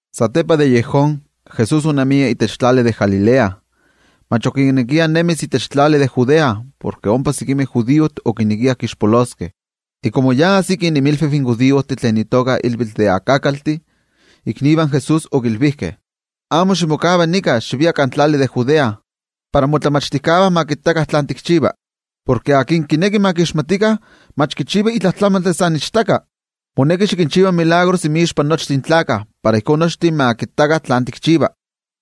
Satepa de yejón, Jesús onemia itech tlali de Galilea. Mach okinekia nemis itech tlali de Judea, porke ompa sekimeh judiojtih okinekiah kixpoloskeh. Iva komo yi ajsiki inmilviv in judiojtih tlen itoka ilvitl de Sakakaltih, iknivah in Jesús okilvijkeh: —Amo ximokava nika, xivia kan tlali de Judea, para ke tlen tikinmachtia ma kittakah tlen tikchiva. Porke se tlen kineki ma kixmatikah, mach kichiva itla tlamantli san ichtaka. Moneki xikinchiva tetzavkaneskayomeh inmixpa nochtin tlaltikpaktlakah para ijkó nochtin ma kittakah tlen tikchiva.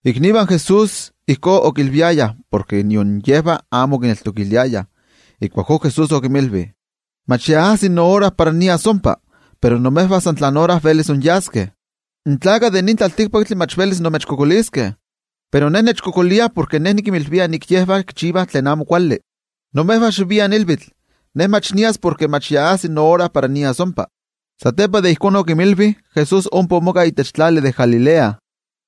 Iknivah in Jesús ijkó okilviayah, porke nion yejvah amo okineltokiliayah. Ijkuakó Jesús okinmilvi: —Mach ya ajsi noora para nias ompa, pero imejvah san tlan ora velis inyaskeh. In tlaltikpaktlakah mach velis imechkualankaitaskeh, pero Ne nechkualankaitah porke Ne nikinmilvia ke yejvah kichivah tlen amo kuali. Imejvah xiviah ilvitl. Ne mach nias porke mach yi ajsi noora para nias ompa. Satepa de ijkó okinmilvi, Jesús ompa omoka itech tlali de Galilea.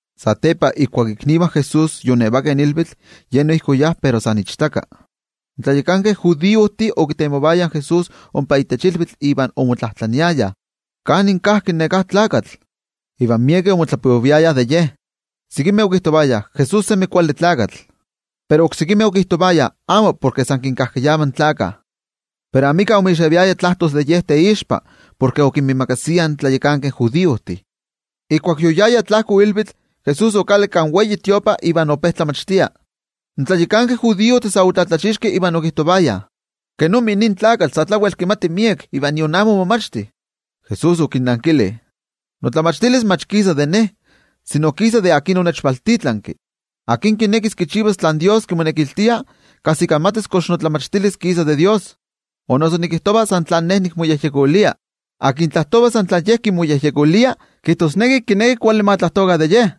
Satepa, ijkuak iknivah in Jesús yoonevakeh ilvitl, Ye noijki oyá pero san ichtaka. In tlayakankeh judiojtih okitemovayah in Jesús ompa itech ilvitl iva omotlajtlaniayah: —¿Kanin kajki neká tlakatl? Iva miekeh omotlapoviayah de Ye. Sekimeh okijtovayah: “Jesús yi neli tlakamela.” Pero oksekimeh okijtovayah: “Amo, porke san kinkajkayava in gentejtih.” Pero amika omixeviaya tlajtos de Ye teixpa, porke okinmiimakasiah in tlayakankeh judiojtih. Ijkuak yoyaya tlajko ilvitl, Jesús okalakki kan templo iva ope tlamachtia. In tlayakankeh judiojtih sa otlatlachixkeh iva okijtovayah: —¿Kenomi nin tlakatl sa tlawel kimati miek, iva nion amo omomachti? Jesús okinnankili: —Notlamachtilis mach kisa de Ne, sino kisa de yen tlen onechvaltitlanki. Tla íkka kinekis kichivas tlen Dios kimonekiltia, kajsikamatis notlamachtilis kox kisa de Dios, o noso nikijtova san tlen Ne nikmoyejyekolia. Tlen tlajtova san tlen ye kimoyejyekolia, kijtosneki kineki kuali ma tlajtokah de ye.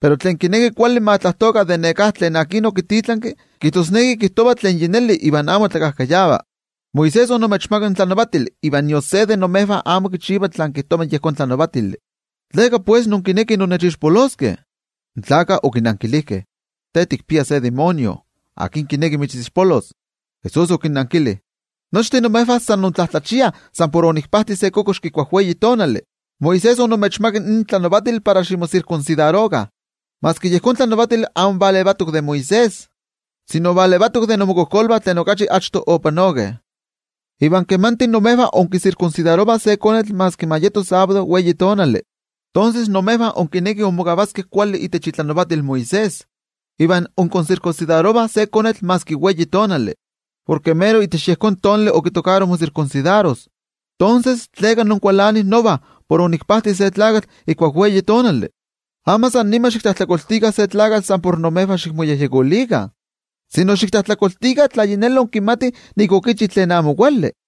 Pero tlen kineki kuali ma tlajtokah de neká tlen okivaltitlanki, kijtosneki kijtova tlen yi neli iva amo tlakajkayava. ’Moisés omechmakak in tlanavatili, iva nion se de imejvah amo kichiva tlen kijtova yejón tlanavatili. ¿Tleka pues inkinekih innechixpoloskeh? In gentejtih okinankilijkeh: —Te tikpia se amo kuali ejekatl, ¿akin kineki mitzixpolos? Jesús okinnankili: —Nochtin imejvah sa intlatlachiah san por onikpajti se kokoxki ijkuak sábado. Moisés omechmakak in tlanavatili para ximosirkunsidarokah, maski yejón tlanavatili amo valevatok de Moisés, sino valevatok de inmokojkolvah tlen okachi achto opanokeh. Iva valeva imejvah inkisirkunsidarovah se konetl maski ma yeto sábado. Imejvah inkinekih inmokavaskeh kuali itech itlanavatil Moisés iva inkisirkunsidarovah se konetl maski sábado porke mero itech yejón tonali okitokaro mosirkunsidaros, tonses, ¿tleka inkualanih nova por onikpajti se tlakatl ijkuak sábado? Amo san nima xiktlajtlakoltikah se tlakatl san por imejvah xikmoyejyekolikah, sino xiktlajtlakoltikah tla yi neli inkimatih nik okichi tlen amo kuali.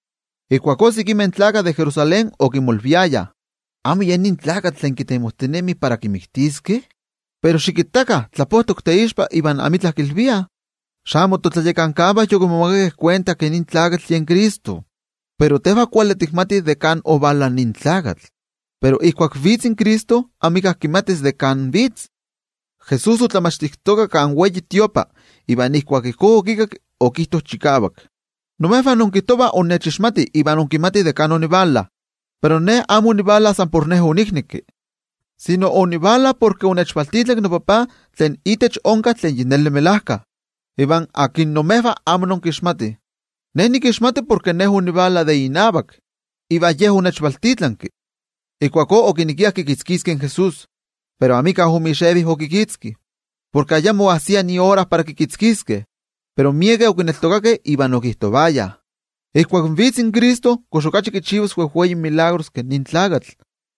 Ijkuakó sekimeh gentejtih de Jerusalén okimolviayah: —¿Amo ye nin tlakatl tlen kitemojtinemih para kimiktiskeh? Pero, xikittakah, tlapojtok teixpa iva amitla kilviah. ¿Xamo in totlayakankavah yokimomakakeh kuenta ke nin tlakatl yen Cristo? Pero tejvah kuali tikmatih de kan ovala nin tlakatl. Pero ijkuak vitz in Cristo, amika kimatis de kan vitz. Jesús otlamachtijtoka kan templo, iva ijkuak ijkó okikakki, okijto chikavak: —¡Imejvah inkijtovah innechixmatih iva inkimatih de kan onivala! Pero Ne amo onivala san por Ne oniknekki, sino onivala porke onechvaltitlanki noTajtzi tlen itech onka tlen melajkayotl, ivan tlen imejvah amo inkixmatih. Ne nikixmati porke Ne onivala de inavak, iva Ye onechvaltitlanki. Ijkuakó okinekiah kikitzkiskeh in Jesús. Pero amika omixevi okikitzki, porke ayamo oajsia iora para kikitzkiskeh. Pero miekeh okineltokakeh, iva okijtovayah: —Ijkuak vitz in Cristo, ¿kox kinchivas okachi wejwei tetzavkaneskayomeh ke nin tlakatl?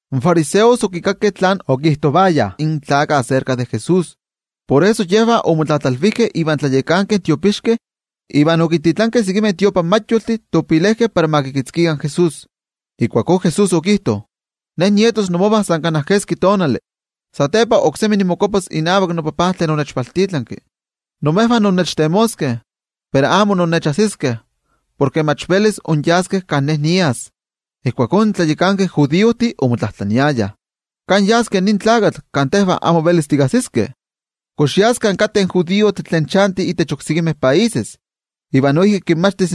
In fariseos okikakkeh tlen okijtovayah in gentejtih de yen Jesús, por eso yejvah omotlatlalvijkeh invan tlayakankeh tiopixkeh, iva okintitlankeh sekimeh templojmayoltih para ma kikitzkikah in Jesús. Ijkuakó Jesús okijto: —Ne nietos inmovah sa kana keski tonali, satepa oksemi nimokuapas inavak noTajtzi tlen onechvaltitlanki. Imejvah innechtemoskeh, pero amo innechajsiskeh, porke mach velis inyaskeh kan Ne nias. Ijkuakó in tlayakankeh judiojtih omotlajtlaniayah: —¿Kan yas nin tlakatl kan tejvah amo velis tikajsiskeh? ¿Kox yas kan kateh in judiojtih tlen chantih itech oksekimeh países, iva noijki kinmachtis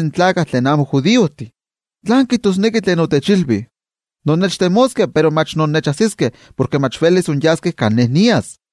tlen amo judiojtih? ¿Tlán kijtosneki tlen otechilvi: “Innechtemoskeh pero mach innechajsiskeh, porke mach velis inyaskeh kan Ne nias”?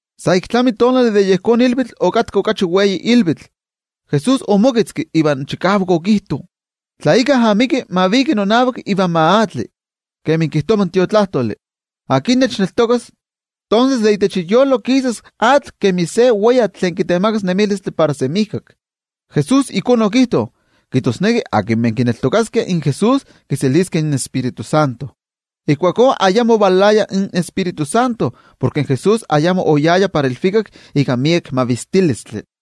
Sa ik tlami tonali de yejón ilvitl okatka okachi wei ilvitl. Jesús omoketzki iva chikavak okijto: —Tla íkka amiki, ma viki nonavak iva ma atli. Kemi kijtova in Tiotlajkuiloli, tlen nechneltokas, tonses de itech iyolo kisas atl kemi se weyatl tlen kitemakas nemilistli para semijkak. Jesús ijkó okijto kijtosneki akinmeh kineltokaskeh in Jesús kiseliskeh in Tioijyotzintli. Ijkuakó ayamo ovalaya in Tioijyotzintli porke in Jesús ayamo oyaya para ilvikak ika miek mavistilistli.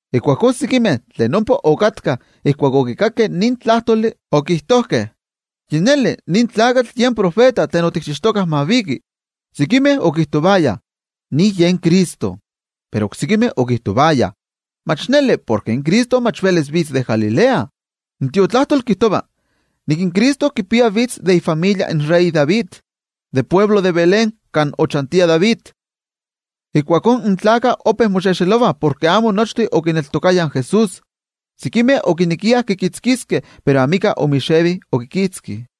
Ijkuakó sekimeh tlen ompa okatkah, ijkuak okikakkeh nin tlajtoli, okijtojkeh: —Yi neli, nin tlakatl yen tiotenejmachti tlen otikchixtokah ma viki. Sekimeh okijtovayah: —Nin yen Cristo. Pero oksekimeh okijtovayah: —Mach neli porke in Cristo mach velis vitz de Galilea. In Tiotlajkuiloli kijtova nik in Cristo kipia tlen valajtos de David, de altepetl de Belén kan ochantia in David. Ijkuakó, in gentejtih ope moxexelovah porke amo nochtin okineltokayah in Jesús. Sekimeh okinekiah kikitzkiskeh, pero amika omixevi okikitzki.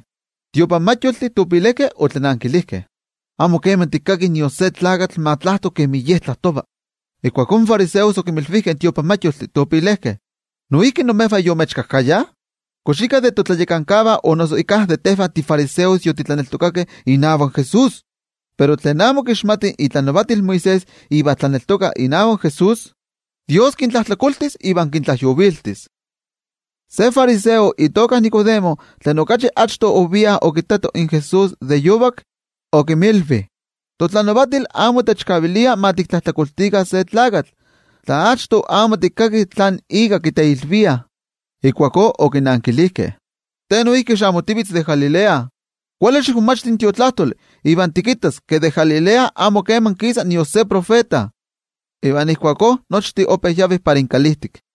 In templojmayoltih otlanankilijkeh: —¡Amo kema tikkakih nion se tlakatl ma tlajto kemi Ye tlajtova! Ijkuakó in fariseos okinmilvijkeh in templojmayoltih: —¿Noijki imejvah yomechkajkayah? ¿Kox íkka de totlayakankavah o noso íkka de tejvah tifariseos yotitlaneltokakeh inavak Jesús? Pero tlen amo kixmatih itlanavatil Moisés iva tlaneltokah inavak Jesús, Dios kintlajtlakoltis iva kintlajyoviltis. Se fariseo itoka Nicodemo, tlen okachi achto ovia okittato in Jesús de yovak, okinmilvi: —Totlanavatil amo techkavilia ma tiktlajtlakoltikah se tlakatl, tla achto amo tikkakih tlan ika kiteilviah. Yejvah okinankilijkeh: —¿Te noijki xamo tivitz de Galilea? Kuali xikmomachti in Tiotlajkuiloli iva tikittas ke de Galilea amo keman kisa nion se tiotenejmachti. Iva ijkuakó nochtin ope yavih para inkalijtik.